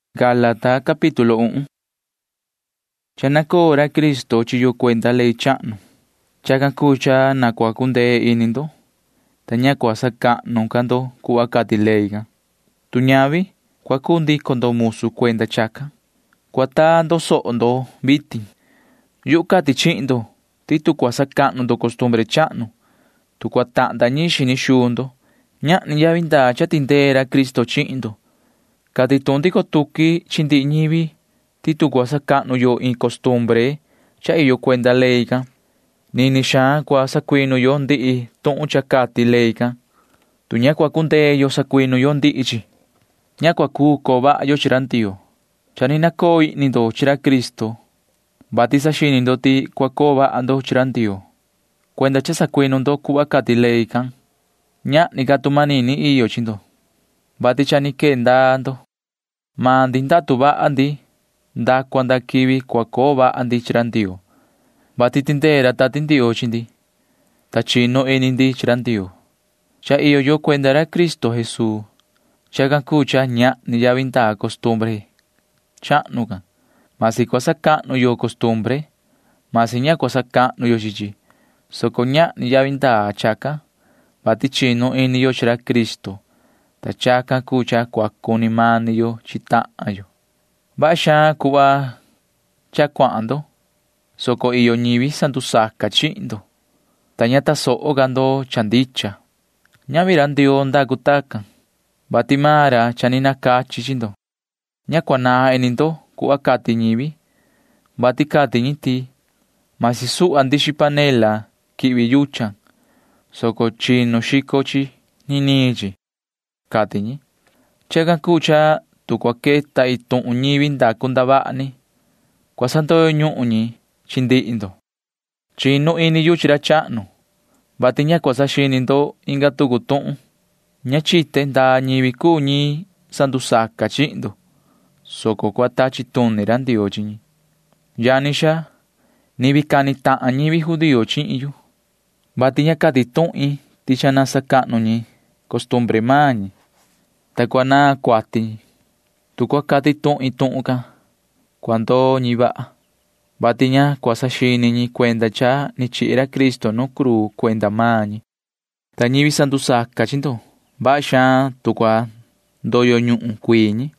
Cha nuna vaha xaan ra Cristo iti chi yo cuenda ley chahnu. Chacan cuu cha na cua cundee ini ndo, ta ña cua sacahnu ca ndo cuhva cati ley can. Tu ñavi, cua cuu ndico ndo musu cuenda chacan. [Cua taa ndo soho ndo vitin.] Yuhu cati chihin ndo ti tu cua sacahnu ndo costumbre chahnu, tu cua tahnda ñiin xini xuu ndo, ñahni yavi ndaa cha tindee ra Cristo chihin ndo. Cati tuhun ndico tuqui chi ndihi ñivi ti tu cua sacahnu yo iin costumbre cha iyo cuenda ley can, nini xaan cua sacuinu yo ndihi tuhun cha cati maan ley can. [Tu ña cua cundee yo sacuinu yo ndihi chi, ña cua cuu coo vaha yo chi ra Ndioo.] Cha ni nacoo ihni ndo chi ra Cristo, vati saxini ndo ti cua coo vaha ndo chi ra Ndioo, [vati cuenda cha sacuinu ndo cuhva cati ley can]. Ñahni ca tu manini iyo chi ndo, vati cha ni quee ndaa ndo. Maan ndi ndatu vaha ndi nda cua nda quivi cua coo vaha ndi chi ra Ndioo, vati tindee ra Tati Ndioo, ta chinu ini ndi chi ra Ndioo. Cha iyo yo cuenda ra Cristo Jesuu. Chacan cuu cha ñahni yavi ndaa costumbre chahnu can. Masi cua sacahnu yo costumbre, masi ña cua sacahnu yo chi chi, soco ñahni yavi ndaa chacan. Ni vii chinu ini yo chi ra Cristo, ta chacan cuu cha cua cuni mani yo chi tahan yo. Vaha xaan cuhva cha ni cuahan ndo, soco iyo ñivi sandusaca chihin ndo, ta ña tasoho ca ndo cha ndicha. Ñavi ra Ndioo cuu ra cati tacan, vati maan ra cha ni nacachi chi ndo. [Ña cua naan ini ndo cuhva cati ñivi, vati cati ñi ti] vasi suhva ndixi panela quihvi yuchan, soco chinu xico chi niniin chi, cati ñi. [Chacan cuu cha tu cua queta iin tuhun ni ñivi ndacu ndavaha ni, cua sandoyo ñuhun ñi chi ndihi ndo.] Chinu ini yu chi ra chahnu, vati ña cua saxini ndo inga tucu tuhun. Ña chite ndaa ñivi cuu ñi sandusaca chihin ndo, soco cua tachi tuni ra Ndioo chi ñi. Yani xaa, ni vii cani tahan ñivi judío chihin yu, vati ña cati tuhin ti cua sacahnu ñi costumbre maan ñi, ta cua naan cuati ñi. Tu cua cati tuhin tuhun can, cua ndoo ñi vaha, vati ña cua saxini ñi cuenda cha ni chihi ra Cristo nu cruu cuenda maan ñi. Ta ñivi sandusaca chi ndo―vaha xaan tu cua ndoyo ñuhun cuii ñi.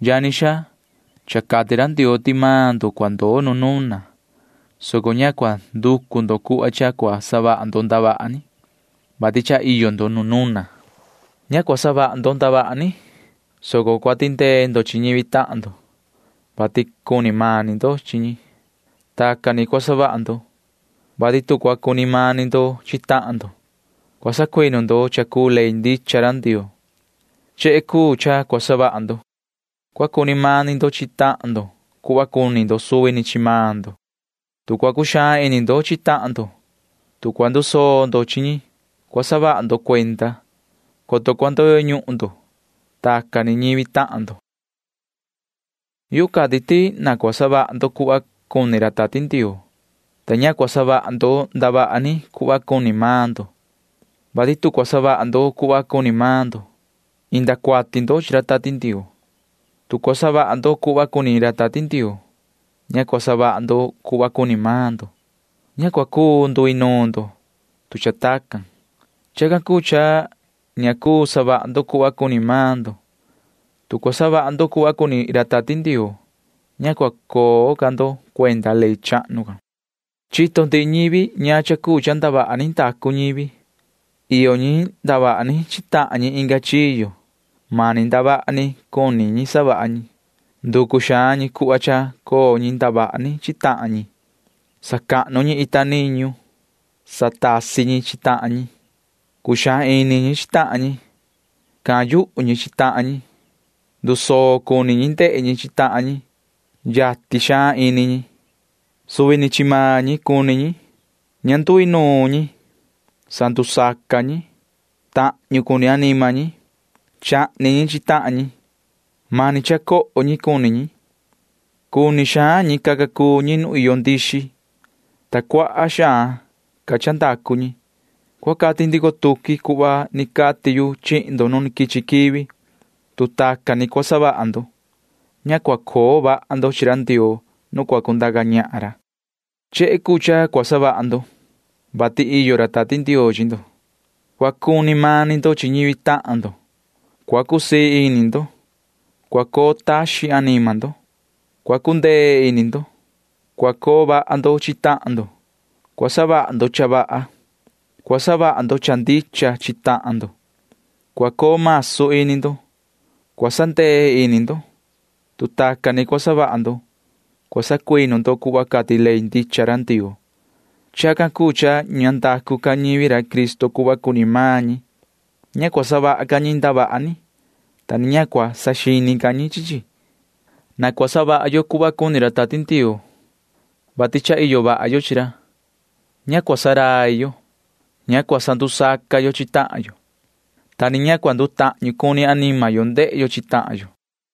Yani xaa, cha cati ra Ndioo ti maan ndo cua ndoo nu nuna, soco ña cua nducu ndo cuhva cha cua savaha ndo ndavaha ni, vati cha iyo ndo nu nuna. Ña cua savaha ndo ndavaha ni, soco cua tindee ndo chi ñivi tahan ndo, vati cua cuni mani ndo chi ñi. Tacan ni cua savaha ndo, vati tu cua cuni mani ndo chi tahan ndo, cua sacuinu ndo cha cuu ley ndicha ra Ndioo. Chehe cuu cha cua savaha ndo. Cua cuni mani ndo chi tahan ndo cuhva cuni ndo suvi ni chi maan ndo. Tu cua cuxaan ini ndo chi tahan ndo, tu cua ndusoo ndo chi ñi, cua saha ndo cuenda, coto cua ndoyo ñuhun ndo chi ñivi tahan ndo. Yuhu cati ti na cua savaha ndo cuhva cuni ra Tati Ndioo, ta ña cua savaha ndo ndavaha ni cuhva cuni maan ndo. Tu cua savaha ndo cuhva cuni maan ndo, ña cua cuu savaha ndo cuhva cuni ra Tati Ndioo. Tu cua savaha ndo cuhva cuni ra Tati Ndioo, ña cua savaha ndo cuhva cuni maan ndo. Ña cua cuu nduinuun ndo, tu cha tacan. Chacan cuu cha ña cuu savaha ndo cuhva cuni maan ndo. Tu cua savaha ndo cuhva cuni ra Tati Ndioo, ña cua coo ca ndo cuenda ley chahnu can. Chito ndihi ñivi ñaan cha cuu cha ndavaha ni ndacu ñivi. Iyo ñi ndavaha ni chi tahan ñi inga chiyo. Mani ndavaha ni can cuni ñi savaha ñi. Nducu xaan ñi cuhva cha coo ñi ndavaha ni chi tahan ñi. Sacahnu ñi ita niñu. Satasi ñi chi tahan ñi. Cuxaan ini ñi chi tahan ñi. Cahan yuhu ñi chi tahan ñi. Ndusoo cuni ñi ndehe ñi chi tahan ñi. Yatin xaan ini ñi. Cuni ñi suvi ni chi maan ñi. Ña nduinuun ñi. Sandusaca ñi. Tahñu cuni anima ñi. Chahni ñi chi tahan ñi. Mani cha coho ñi cuni ñi. Cuni xaan ñi caca cuu ñi nu iyo ndixi, ta cuaha xaan ca cha ndacu ñi. Cua cati ndico tuqui cuhva cati yu chihin ndo nu quichi quivi. Tu tacan ni cua savaha ndo, ña cua coo vaha ndo chi ra Ndioo nu cua cundaca ñahan ra. Chehe cuu cha cua savaha ndo, vati iyo ra Tati Ndioo chi ndo. Cua cuni mani ndo chi ñivi tahan ndo. Cua cusii ini ndo. Cua coo taxin anima ndo. Cua cundee ini ndo. Cua coo vaha ndo chi tahan ndo. Cua savaha ndo cha vaha. Cua savaha ndo cha ndicha chi tahan ndo. Cua coo masu ini ndo. Cua sandee ini ndo. Tu tacan ni cua savaha ndo, cua sacuinu ndo cuhva cati ley ndicha ra Ndioo. Chacan cuu cha ña ndacu ca ñivi Cristo cuhva cuni maan ñi. Ña cua savaha ca ñi ndavaha ni, ta ni ña cua saxini ca ñi chi chi. Na cua savaha yo cuhva cuni ra Tati Ndioo, vati cha iyo vaha yo chi ra. Ña cua ndurai yo. Ña cua sandusaca yo chi tahan yo, ta ni ña cua ndutahñu anima yo ndehe yo chi tahan yo.